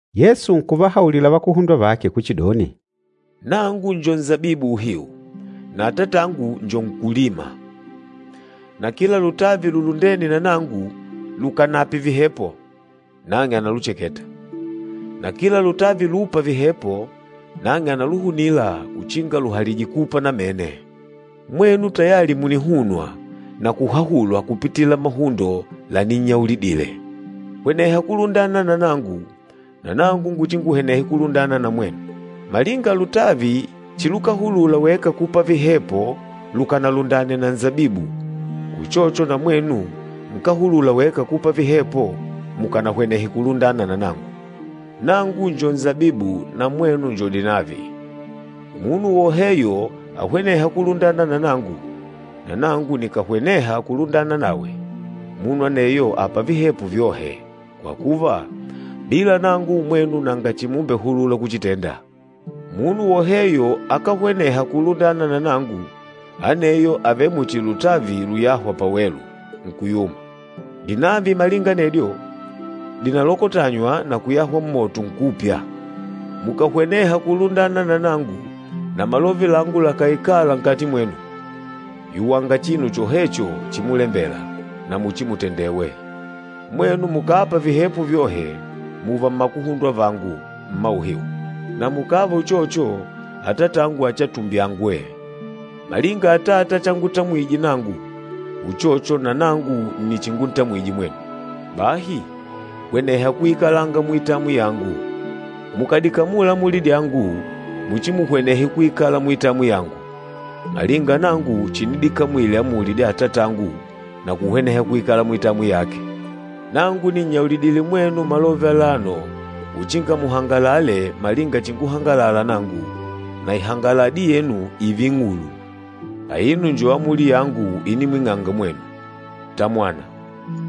Yesu nkuvahaulila vakuhundwa vake kuchidoni, “Nangu njo nsabibu uhiu, na Atatangu njo nkúlima. Na kila lutavi lulundêne na nangu lukànape vihepo, nang'e analucheketa, na kila lutavi lûpa vihepo, nang'e ànaluhunila uchinga luhalije kupa namene. Mwenu tayali munihunwa na kuhahulwa kupitila mahundo laninnyaulidile. Hweneha kulundana na nangu, na nangu nguchinguhwenehe kulundana na mwenu. Malinga lutavi chilukahulula weka kupa vihepo lukanalundane na nsabibu, uchocho na mwenu nkáhulula weka kupa vihepo mukanahwenehe kulundana na nangu. Nangu njo nsabibu na mwenu njo dinavi. Munu woheyo ahwenêha kulundana na nangu, na nangu nikàhweneha kulundana nawe, munu aneyo àpa vihepo vyohe, kwa kuva, bila nangu mwenu nanga chimumbehulula kuchitenda. Munu woheyo akáhweneha kulundana na nangu, aneyo àvele muchi lutavi luyâhwa pawelu, nkuyuma. Dinavi malinga anedyo, dìnalokotanywa na kuyahwa mmoto, nkupya. Mukàhweneha kulundana na nangu na malove langu lakàikala nkati mwenu, yuwanga chinu chohecho chimulembela, na muchimutendewe. Mwenu mukàpa vihepo vyohe, mùva mmakuhundwa vangu mma uhiu, na mukàva uchocho Atatangu achiatumbyangwe. Malinga Atata changutamwije nangu, uchocho na nangu nni chinguntamwije mwenu. Bahi hweneha kuikalanga muitamwi yangu. Mukàdikamula amuli dyangu muchimuhwenehe kuikala muitamwi yangu, malinga nangu chinidikamwile amuli dya Atatangu na kuhweneha kuikala muitamwi yake. Nangu nìnnyaulidile mwenu malove alano uchinga muhangalale malinga chinguhangalala nangu, na ihangaladi yenu ììve ing'ulu. Aino njo amuli yangu inimwing'anga mwenu, Tamwana,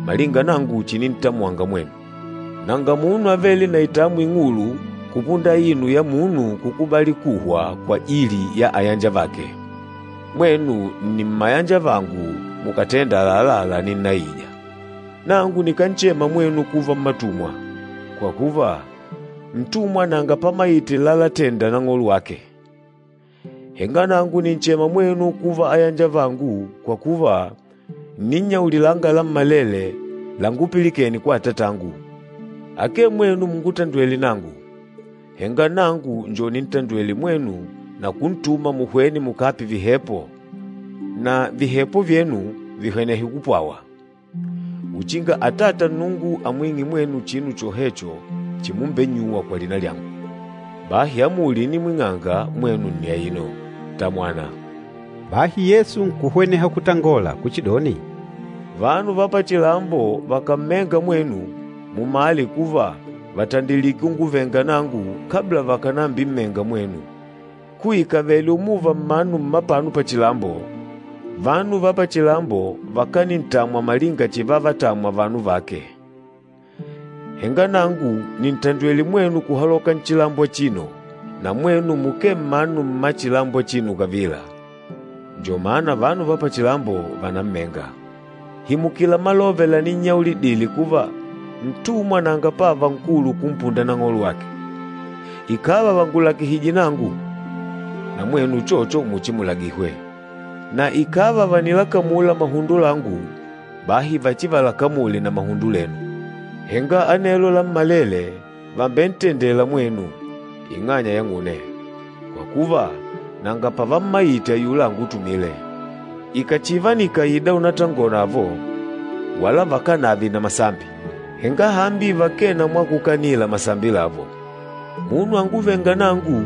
malinga nangu chinintamwanga mwenu. Nanga munu avêle na itamwi ing'ulu kupunda aino ya munu kukubali kuhwa kwajili ya ayanjavake. Mwenu nni mmayanjavangu, mukàtenda àlalá laninnaija. Nangu nikánchema mwenu kuva mmatumwa, kwa kuva, ntumwa nanga pamaite lalatenda nang'olo wake. Henga nangu nìnchema mwenu kuva ayanjavangu kwa kuva ǹninnyaulilanga lammalele langupilikene kwa Atatangu. Akee mwenu mungutandwêle nangu, henga nangu njo nintandwêle mwenu na kuntuma muhwene mukape vihepo na vihepo vyenu vihwenehe kupwawa, uchinga Atata Nnungu amwing'e mwenu chinu chohecho chimumbennyuwa kwa lina lyangu. Bahi amuli inimwing'anga mwenu nni aino, Tamwana.” Bahi Yesu nkuhweneha kutangola kuchidoni, “Vanu va pachilambo vakàmmenga mwenu, mumale kuva vàtandilike unguvenga nangu kabla vakànambimmenga mwenu. Kuikavele umuva mmanu mmapano pachilambo, vanu va pachilambo vakanintamwa malinga chivavatamwa vanu vake. Henga nangu nìntandwele mwenu kuhaloka nchilambo achino, na mwenu mukee mmanu mmachilambo achino kavila, njo mana vanu va pachilambo vànammenga. Himukila malove laninnyaulidile kuva, ntumwa nanga pávà nkulu kumpunda nang'olo wake. Ikàva vàngulagihije nangu, na mwenu uchocho muchimulagihwe. Na ikàva vànilakamula mahundo langu, bahi vachivalakamule na mahundo lenu. Henga anelo lammalele vàmbentendela mwenu, ing'anya yang'une, kwa kuva, nanga pavammaite ayula angutumîle. Ikàchiva nikáida únatangonavo, wala vakánave na masambi, henga hambi vakee na mwakukanila masambi lavo. Munu anguvênga nangu,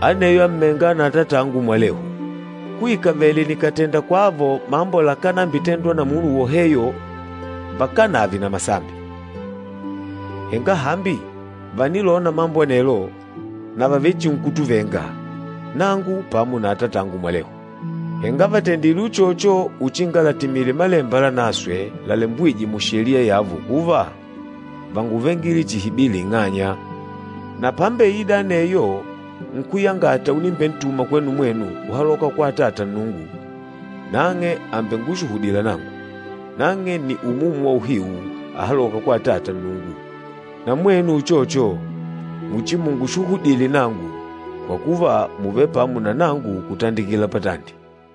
aneyo àmmenga na Atatangu mwalehu. Kuikavele nikátenda kwavo mambo lakánambitendwa na munu woheyo vakánave na masambi. Henga hambi vànilona mambo anelo, na vàvechinkutuvenga, nangu pamo na Atatangu mwalehu. Henga vàtendile uchocho uchinga latimile Malemba Lanaswe lalembwîjwe mu Sheliya yavo kuva, ‘Vánguvengile chihi bila ing'anya!’ Na pámbeìdà aneyo Nkúyangata unimbentuma kwenu mwenu kuhaloka kwa Atata Nnungu, nang'e àmbengushuhudila nangu. Nang'e nni Umumu wa uhiu ahalôka kwa Atata Nnungu. Na mwenu uchocho, muchimungushuhudile nangu, kwa kuva mùvele pamo na nangu kutandikila patandi.”